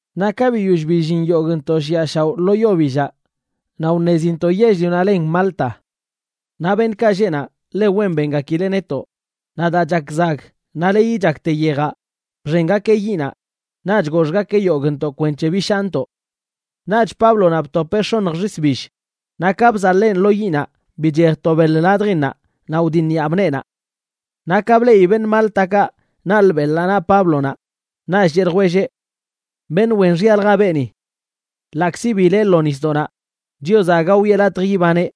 Naꞌ ka biyoll billin yogꞌntoꞌ shiꞌa shaoꞌ lo yo billaꞌ, naꞌ wṉezintoꞌ yell-lionaꞌ len Malta. Naꞌ beṉꞌkaꞌ lleꞌ naꞌ ḻe wen bengakileꞌ netoꞌ, naꞌ daa chak zag naꞌ leyi chakte yejaꞌ, bxengakeꞌ yiꞌnaꞌ xen naꞌch goxgakeꞌ yogꞌntoꞌ kwenc̱he bishaantoꞌ. Naꞌch Páblonaꞌ btopeꞌ x̱onj xis bill, naꞌ ka bzaḻeen lo yiꞌnaꞌ bichej to beḻ ladjinnaꞌ naꞌ wdiṉyaab neenaꞌ. Naꞌ ka bleꞌi beṉꞌ Máltakaꞌ naḻꞌ beḻaꞌ naꞌ Páblonaꞌ, naꞌch cheꞌ ljwelleꞌ: ―Beṉꞌ wen xyalja beeni. Ḻaꞌkzi bileꞌ lo nisdoꞌnaꞌ, Chiozaꞌ aga wiꞌe latj ibaneꞌ.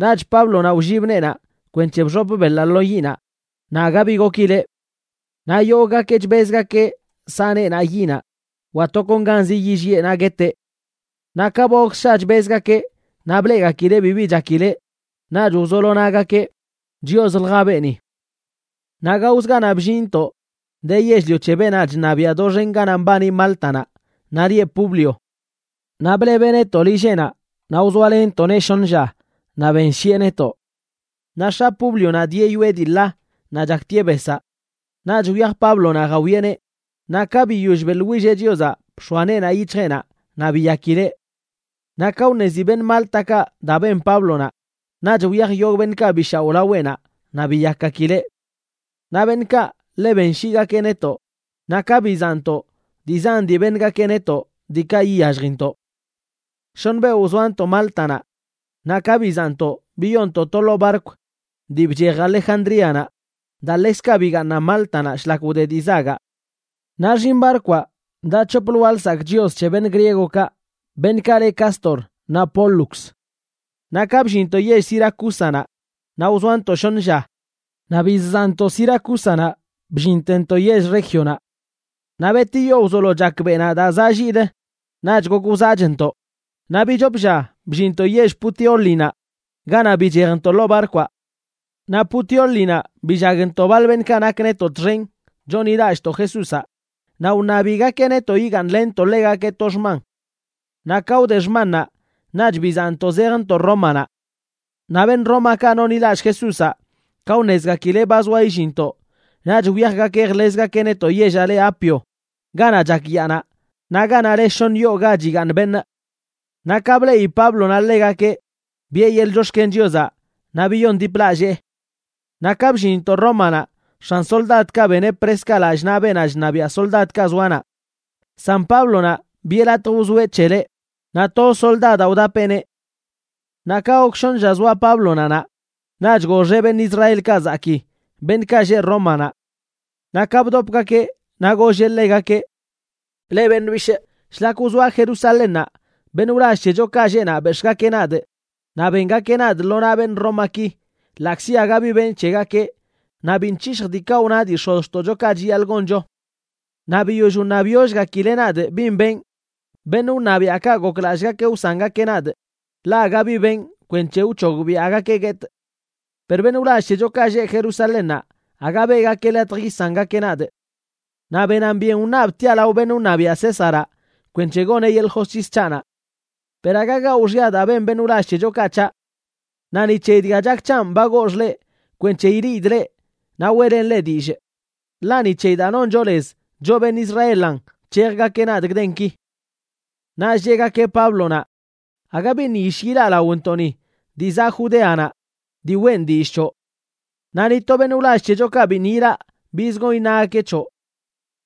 Naꞌch Páblonaꞌ wllib neenaꞌ kwenc̱he bxop beḻaꞌ lo yiꞌnaꞌ, naꞌ aga bi gokileꞌ. Naꞌ yoggakeꞌ chbezgakeꞌ saꞌ neenaꞌ yinaꞌ, wa tokonganzi yilliꞌe naꞌ gueteꞌ. Naꞌ ka ba gok ssha chbezgakeꞌ naꞌ bleꞌgakileꞌ bibi chakileꞌ, naꞌch wzolo nagakeꞌ: ―Chioslja beeni. Naꞌ gaozə ganaꞌ bllinntoꞌ de yell-lio c̱he beenaꞌ chṉabiaꞌ doxen ganaꞌ mbani Máltanaꞌ, naꞌ lieꞌ Publio. Naꞌ blebeꞌ netoꞌ lilleꞌnaꞌ naꞌ wzoalenntoꞌneꞌ shoṉ lla naꞌ benshiꞌe netoꞌ. Naꞌ x̱a Públionaꞌ dieꞌ yoꞌe dii ḻa naꞌ chaktieꞌ besaꞌ. Naꞌch wyaj Páblonaꞌ jawieꞌneꞌ, naꞌ ka biyoll beꞌḻwilleꞌ Chiozaꞌ bx̱oa neenaꞌ yic̱hjeꞌnaꞌ naꞌ biyakileꞌ. Naꞌ ka wṉezi beṉꞌ Máltakaꞌ daa ben Páblonaꞌ, naꞌch wyaj yogꞌ beṉꞌkaꞌ bi shaoꞌ laweꞌnaꞌ naꞌ biyakgakileꞌ. Naꞌ beṉꞌkaꞌ ḻe benshiigakeꞌ netoꞌ, naꞌ ka bizaꞌntoꞌ, dii zan dii beṉgakeꞌ netoꞌ, diikaꞌ iyalljintoꞌ. Shoṉ beoꞌ wzoantoꞌ Máltanaꞌ. Naꞌ ka bizaꞌntoꞌ biyoontoꞌ to ḻoo barkw dii bchej Alejandríanaꞌ daa ḻekzkaꞌ bigaaṉan Máltanaꞌ shlak wde dii zagaꞌ. Naꞌ xinꞌ barkwaꞌ daꞌ c̱hop lwaa lsakꞌ chios c̱he beṉꞌ griegokaꞌ, beṉꞌkaꞌ le Cástor naꞌ Pólux. Naꞌ ka bllinntoꞌ yell Siracúsanaꞌ, naꞌ wzoantoꞌ shoṉə lla. Naꞌ bizzaꞌntoꞌ Siracúsanaꞌ bllintentoꞌ yell Régionaꞌ. Naꞌ betiyo wzolo chak beꞌnaꞌ daa zaꞌ lliꞌlə naꞌch gok wzaꞌchntoꞌ, naꞌ bichop lla bllinntoꞌ yell Puteólinaꞌ ganaꞌ bichejntoꞌ ḻoo barkwaꞌ. Naꞌ Puteólinaꞌ billagntoꞌ baḻ beṉꞌkaꞌ nak netoꞌ txen chonḻilallꞌntoꞌ Jesúzaꞌ, naꞌ wṉabigakeꞌ netoꞌ yigaaṉlenntoꞌ ḻegakeꞌ to xman. Naꞌ ka wde xmannaꞌ, naꞌch bizaꞌntoꞌ zejntoꞌ Rómanaꞌ. Naꞌ beṉꞌ Rómakaꞌ nonḻilallꞌ Jesúzaꞌ, ka wṉezgakileꞌ ba zoa illinntoꞌ, naꞌch wyajgakeꞌ jḻezgakeꞌ netoꞌ yellaꞌ le Apio, ganaꞌ chak yaanaꞌ, naꞌ ganaꞌ le Shoṉ Yoo Ga Chigaaṉ Beṉꞌ. Naꞌ ka bleꞌi Páblonaꞌ ḻegakeꞌ, biꞌe yeḻꞌ chox̱ken Chiozaꞌ naꞌ biyondiplallee. Naꞌ ka bllinntoꞌ Rómanaꞌ, x̱an soldadkaꞌ beneꞌ preskaꞌ lallꞌ naꞌ beenaꞌ chṉabiaꞌ soldadkaꞌ zoa naꞌ, san Páblonaꞌ, biꞌe latj wzoeꞌ c̱heleꞌ, naꞌ toz soldadaꞌ wdapeꞌneꞌ. Naꞌ ka gok shoṉ lla zoa Páblonaꞌ naꞌ, naꞌch goxeꞌ beṉꞌ Israelkaꞌ zakii, beṉꞌkaꞌ lleꞌ Rómanaꞌ. Naꞌ ka bdopgakeꞌ naꞌ golleꞌ ḻegakeꞌ: ―Leꞌ beṉꞌ bishꞌ, shlak wzoaꞌ Jerusalénnaꞌ beṉꞌ wlall c̱hechokaꞌ lleꞌ naꞌ bex̱ꞌgakeꞌ nadꞌ naꞌ bengakeꞌ nadꞌ lo naꞌ beṉꞌ Rómaki ḻaꞌkzi aga bi benꞌ c̱hegakeꞌ naꞌ biṉꞌ c̱hishjꞌ diikaꞌ wna dii x̱ozxtoꞌchokaꞌ chiyaḻꞌ goncho. Naꞌ biyoll wṉabyollgakileꞌ nadꞌ bin benꞌ, beṉꞌ wṉabiaꞌkaꞌ goklallꞌgakeꞌ wsangakeꞌ nadꞌ, ḻaꞌ aga bi benꞌ kwenc̱he wc̱hogbiaꞌgakeꞌ guetꞌ. Per beṉꞌ wlall c̱hechokaꞌ lleꞌ Jerusalénnaꞌ aga beꞌgakeꞌ latj yisangakeꞌ nadꞌ. Naꞌ benan byen wṉabꞌ tiaꞌ lao beṉꞌ wṉabiaꞌ Césaraꞌ kwenc̱he goneꞌ yeḻꞌ josc̱his c̱haꞌnaꞌ. Per aga gawꞌ xya daa ben beṉꞌ wlall c̱hechokaꞌ c̱haꞌ. Naꞌ ni c̱heyi dga chak c̱hanꞌ ba goxꞌ leꞌ kwenc̱he ileꞌidꞌ leꞌ naꞌ weꞌlenꞌ leꞌ dillꞌ. Ḻaꞌ ni c̱heyi daa noncho lez, choꞌ beṉꞌ Israelan, nc̱hejgakeꞌ nadꞌ gdenki. Naꞌch cheꞌgakeꞌ Páblonaꞌ: ―Aga biṉꞌ yish ilaꞌ laontoꞌni dii zaꞌ Judeanaꞌ dii weꞌn dillꞌ c̱hoꞌ. Naꞌ ni to beṉꞌ wlall c̱hechokaꞌ biṉꞌ ilaꞌ biz gon iṉagakeꞌ c̱hoꞌ.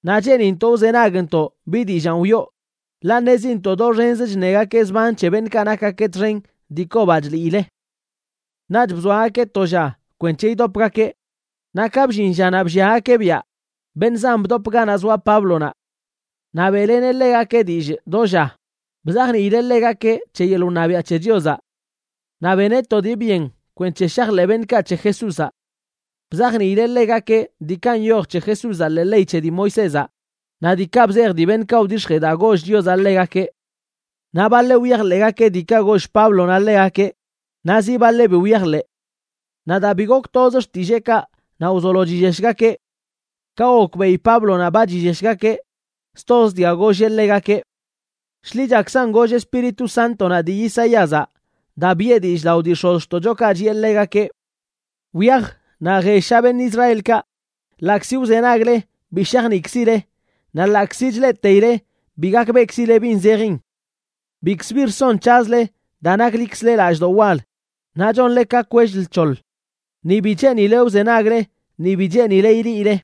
Naꞌ cheenintoꞌ wzenagntoꞌ bi dillaan wiꞌo, ḻaꞌ ṉezintoꞌ doxenz chṉegakeꞌ zban c̱he beṉꞌkaꞌ nakgakeꞌ txen dii kobaꞌ chliile. Naꞌch bzoagakeꞌ to lla kwenc̱he idopgakeꞌ. Naꞌ ka bllin llanaꞌ blliagakeꞌ biaꞌ, beṉꞌ zan bdop ganaꞌ zoa Páblonaꞌ. Naꞌ beꞌleneꞌ ḻegakeꞌ dillꞌ do lla, bzajniileꞌ ḻegakeꞌ c̱he yeḻꞌ wṉabiaꞌ c̱he Chiozaꞌ. Naꞌ beneꞌ to dii byen kwenc̱he shajḻeꞌ beṉꞌkaꞌ c̱he Jesúzaꞌ. Bzajniileꞌ ḻegakeꞌ diikaꞌ nyoj c̱he Jesúzaꞌ ḻee ley c̱he dii Moisézaꞌ naꞌ diikaꞌ bzej dii beṉꞌkaꞌ wdix̱jee daa goll Chiozaꞌ ḻegakeꞌ. Naꞌ baḻeꞌ wyajḻeꞌgakeꞌ diikaꞌ goll Páblonaꞌ ḻegakeꞌ, naꞌ zi baḻeꞌ bi wyajḻeꞌ. Naꞌ daa bi gok toz xtilleekaꞌ, naꞌ wzolo chilleshgakeꞌ. Ka gokbeꞌi Páblonaꞌ ba chilleshgakeꞌ, stoz dga golleꞌ ḻegakeꞌ: ―Shḻichakzan goll Espíritu Sántonaꞌ dii Isaíazaꞌ, daa biꞌe dillꞌ lao dii x̱ozxtoꞌchokaꞌ chiꞌe ḻegakeꞌ: Wyaj naꞌ jellsha beṉꞌ Israelkaꞌ: Ḻaꞌkzi wzenagle bi shajniꞌkzile Naꞌ ḻaꞌkzi chleꞌteile bi gakbeꞌkzile bin zejin. Bikzə bi rson c̱hazle, daa naklikzle lallꞌdoꞌ wal, naꞌ chonle ka kwell lc̱hoḻ, ni bi cheenile wzenagle, ni bi cheenile ileꞌile,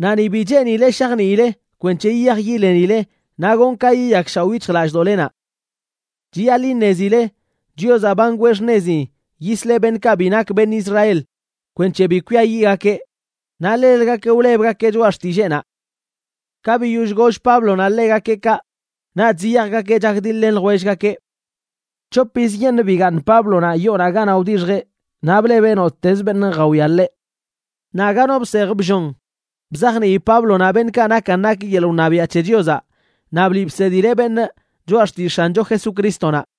naꞌ ni bi cheenile shajniile kwenc̱he yiyaj yilenile naꞌ gonꞌ ka yiyakshaoꞌ yic̱hjlallꞌdoꞌlenaꞌ. Chiyaḻꞌ iṉezile Chiozaꞌ ba ngwee xṉezi yisleꞌ beṉꞌkaꞌ bi nak beṉꞌ Israel kwenc̱he bi kwiayiꞌgakeꞌ, naꞌ ḻelgakeꞌ wlebgakeꞌ choꞌa xtilleenaꞌ. Ka biyoll goll Páblonaꞌ ḻegakeꞌ kaꞌ, naꞌch ziyajgakeꞌ chakdiḻ-len ljwellgakeꞌ. C̱hop yizyeṉꞌ bigaaṉ Páblonaꞌ yoonaꞌ ganaꞌ wdixjeꞌ, naꞌ blebeꞌ nottezə beṉꞌ jawia ḻeꞌ. Naꞌ aga no bsej bllon bzajnii Páblonaꞌ beṉꞌkaꞌ nakan nak yeḻꞌ wṉabiaꞌ c̱he Chiozaꞌ naꞌ bliꞌ bsedileꞌ beṉꞌ choꞌa xtillꞌ X̱ancho Jesucrístonaꞌ.